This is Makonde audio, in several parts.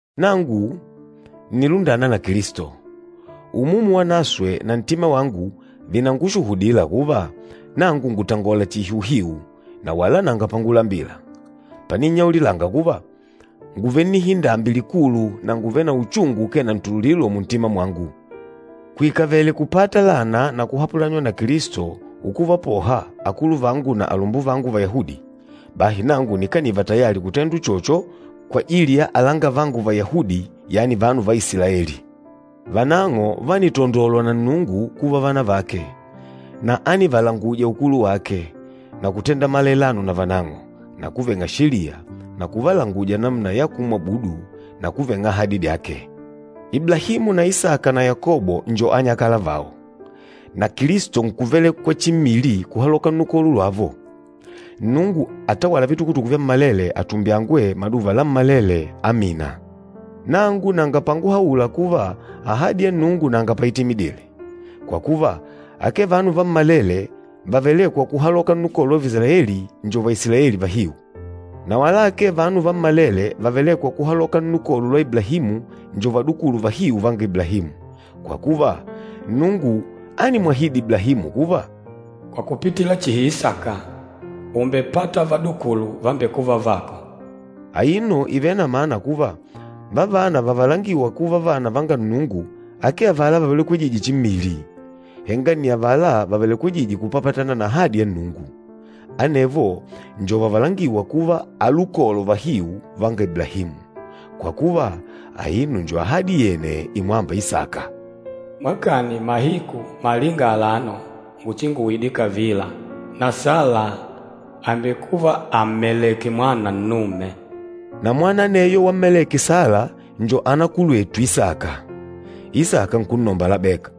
Nangu ǹnilundana na Kilisto. Umumu Wanaswe na ntima wangu vìnangushuhudila kuva, nangu ngùtangola chihi uhiu na wala nanga pangulambila, paninnyaulilanga kuva, ngùvele nnihindambi likulu na ngùvele na uchungu ukee na ntululilo muntima mwangu. Kuikavele kupata lana na kuhapulanywa na Kilisto ukuvapoha akuluvangu na alumbuvangu Vayahudi, bahi nangu nikaniva tayali kutendwa uchocho kwajili ya alangavangu Vayahudi, yani vanu va Isilaeli. Vanang'o vánitandolwa na Nnungu kuva vana vake, na ánivalanguja ukulu wake, na kutenda malailano na vanang'o, na kuveng'a Sheliya, na kuvalanguja namuna ya kumwabudu, na kuveng'a ahadi dyake. Iblahimu na Isaka na Yakobo njo anyakala vao. Na Kilisto nkuvelekwa chimmili kuhaloka nnukolo lwavo. Nnungu atawâla vitukutuku vyammalele atumbyangwe maduva lammalele! Amina. Nangu nanga panguhaula kuva ahadi ya Nnungu nanga paitimidile. Kwa kuva, akee vanu vammalele vavelêkwa kuhaloka nnukolo lwa Vaisilaeli njo Vaisilaeli vahiu. Na wala akee vanu vammalele vavelêkwa kuhaloka nnukolo lwa Iblahimu njo vadukulu vahiu vanga Iblahimu. Kwa kuva, Nnungu ánimwahidi Iblahimu kuva, “Kwa kupitila chihi Isaka, ùmbepata vadukulu vambekûva vako.” Aino ìvele na mana kuva, vavana vavalangîwa kuva vana vanga Nnungu akee avala vavelekwejîje chimmili, henga nni avala vavelekwejîje kupapatana na ahadi ya Nnungu. Anevo njo vavalangîwa kuva alukolo vahiu vanga Iblahimu. Kwa kuva, aino njo ahadi yene imwâmba Isaka, “Mwakani mahiku malinga alano nguchinguide kavila, na Sala àmbekuva àmmelèkè mwana nnume.” Na mwana aneyo wammeleke Sala njo anakulwetu Isaka, Isaka nkunnomba Labeka.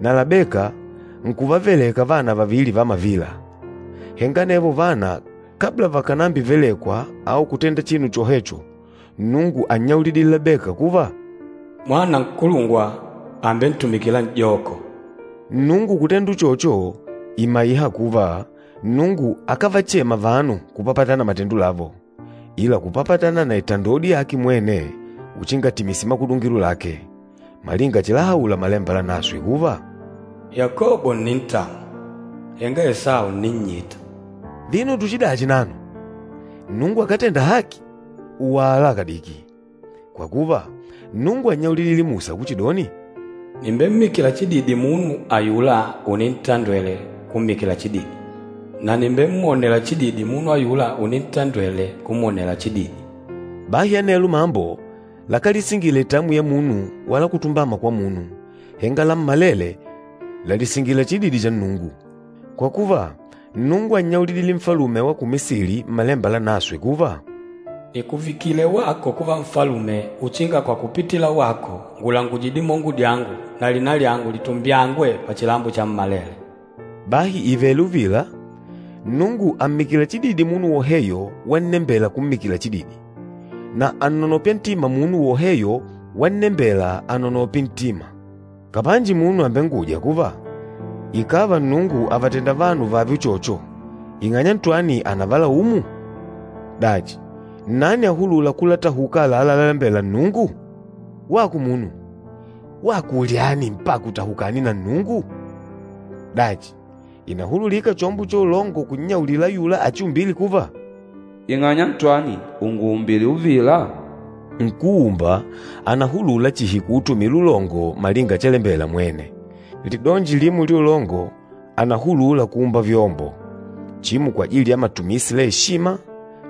Na Labeka nkuvaveleka vana vavili va mavila, henga anevo vana kabla vakànambivelekwa au kutenda chinu chohecho, Nnungu ánnyaulidile Labeka kuva, “Mwana nkulungwa àmbentumikila n'joko.” Nnungu kutenda uchocho, ìmaiha kuva, Nnungu akávachema vanu kupapatana na matendo lavo, ila kupapatana na itandodi yake mwene uchinga atimise makudungilo lake. Malinga chilahaula Malemba Lanaswe kuva, “Yakobo ǹnintamwa, henga Esau ǹninnyita.” Vino tuchidachi nano? Nnungu akátenda haki? Wala kadiki! Kwa kuva, Nnungu ánnyaulidile Musa kuchidoni, “Nìmbemmikila chididi munu ayula unintandwele kummikila chididi, na nìmbemwonela chididi munu ayula unintandwele kumwonela chididi.” Bahi anelo mambo, lakálisingila itamwi ya munu wala kutumbama kwa munu, henga lammalele làlisingila chididi cha Nnungu. Kwa kuva, Nnungu ánnyaulidile Nfalume wa ku Misili Mmalemba Lanaswe kuva, “Nìkuvikile wako kuva Nfalume uchinga kwa kupitila wako ngulanguje dimongo dyangu na lina lyangu litumbyangwe pachilambo chammalele.” Bahi ìvele uvila, Nnungu àmmikila chididi munu woheyo wannembela kummikila chididi, na ànnonopya ntima munu woheyo wannembela anonope ntima. Kapanji munu àmbenguja kuva, “Ikàva Nnungu àvatenda vanu vààve uchocho, ing'anya ntwani ànavalaumu? Dachi, nnani ahulûla kulatahuka àlalá lalalembela Nnungu?” Wako munu, wako ulyani mpaka utahukane na Nnungu? Dachi, ìnahululika chombo cha ulongo kunnyaulila ayula achiumbîle kuva, “Ing'anya ntwani ùnguumbile uvila?” Nkúumba ànahulula chihi kuutumila ulongo malinga chalembela mwene. Lidonji limo lya ulongo ànahulula kuumba vyombo, chimo kwajili ya matumisi la eshima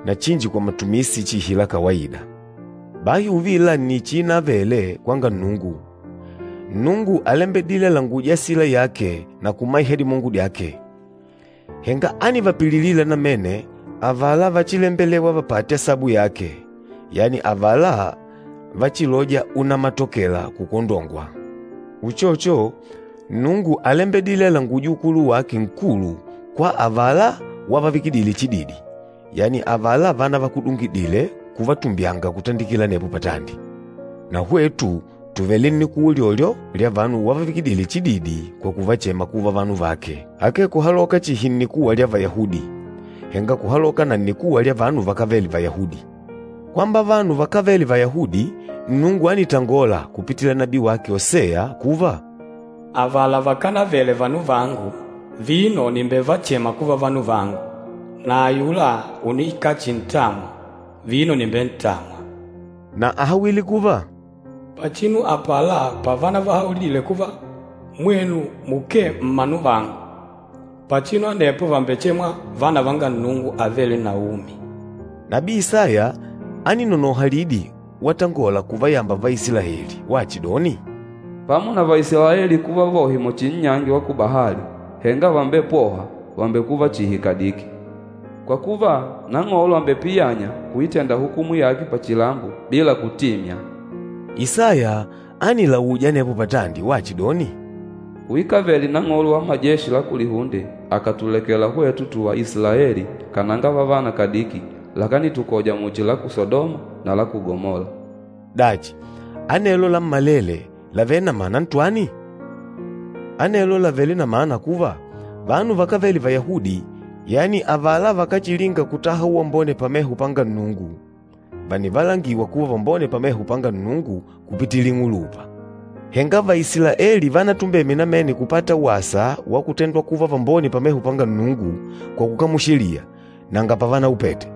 na chinji kwa matumisi chihi la kawaida. Bahi uvila nni chiinavele kwanga Nnungu. Nnungu álembedile alanguje asila yake na kumaiha dimongo dyake. Henga ánivapililila namene avala váchilembelèwà vapate asabu yake, yani avala vachilôja unamatokela kukwondongwa. Uchocho, Nnungu álembedile alanguje ukulu wake nkulu kwa avala wavavikidile chididi, yani avala vanavakudungidile kuvatumbyanga kutandikila anepo patandi. Na hwetu tùvele nnikuwa ulyolyo lya vanu wavavikidile chididi kwa kuvachema kuva vanu vake, akee kuhaloka chihi nnikuwa lya Vayahudi, henga kuhaloka na nnikuwa lya vanu vakávele Vayahudi. Kwamba vanu vakávele Vayahudi Nnungu ánitangola kupitila nabii wake Oseya kuva, “Avala vakanavele vanu vangu, vino nìmbevachema kuva, vanu vangu! Na ayula unikachintamwa, vino nìmbentamwa!” Na áhawile kuva, “Pachinu apala pavanavahaulidile kuva, ‘Mwenu mukee mmanu vangu,’ pachinu anepo vàmbechemwa, ‘Vana vanga Nnungu avêle na umi.’” Nabii Isaya áninonoha lidi watangola kuvayamba Vaisilaeli wachidoni, “Pamo na Vaisilaeli kuva vohe muchi nnyangi wa kubahali, henga vambepôhwa vàmbekuva chihi kadiki. Kwa kuva, Nang'olo àmbepiyanya kuitenda hukumu yake pachilambo bila kutimya.” Isaya ánilauja anepo patandi wachidoni, “Kuikavele Nang'olo wa Majeshi la Kulihunde akátulekela hwetu tùvá Isilaeli kananga vavana kadiki, lakanitukoja muchi la ku Sadoma na la ku Gamola.” Dachi, anelo lammalele làvele na mana ntwani? Anelo làvele na mana kuva, vanu vakávele Vayahudi, yani avala vakáchilinga kutaha uwambone pameho panga Nnungu, vànivalangiwa kuva vambone pameho panga Nnungu kupitila ing'ulupa. Henga Vaisilaeli vanatumbeme namene kupata wasa wa kutendwa kuva vambone pameho panga Nnungu kwa kukamula Sheliya, nanga pavanaupete.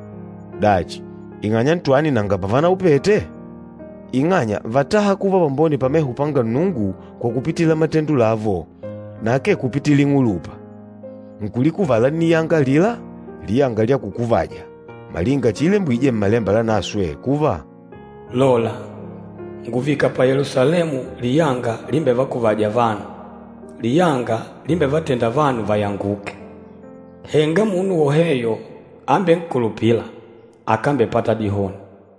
Dachi, ing'anya ntwani nanga pavanaupete? Ing'anya vátaha kuva vambone pameho panga Nnungu kwa kupitila matendo lavo na akee kupitila ing'ulupa. Nkulikuvala nniyanga alila, “liyanga lya kukuvaja,” malinga chiilembwije Mmalemba Lanaswe kuva, “Lola, ngùvika pa Yelusalemu liyanga limbevakuvâja vanu, liyanga limbevatênda vanu vayanguke. Henga munu woheyo ambenkulupîla, akambepata dihoni!”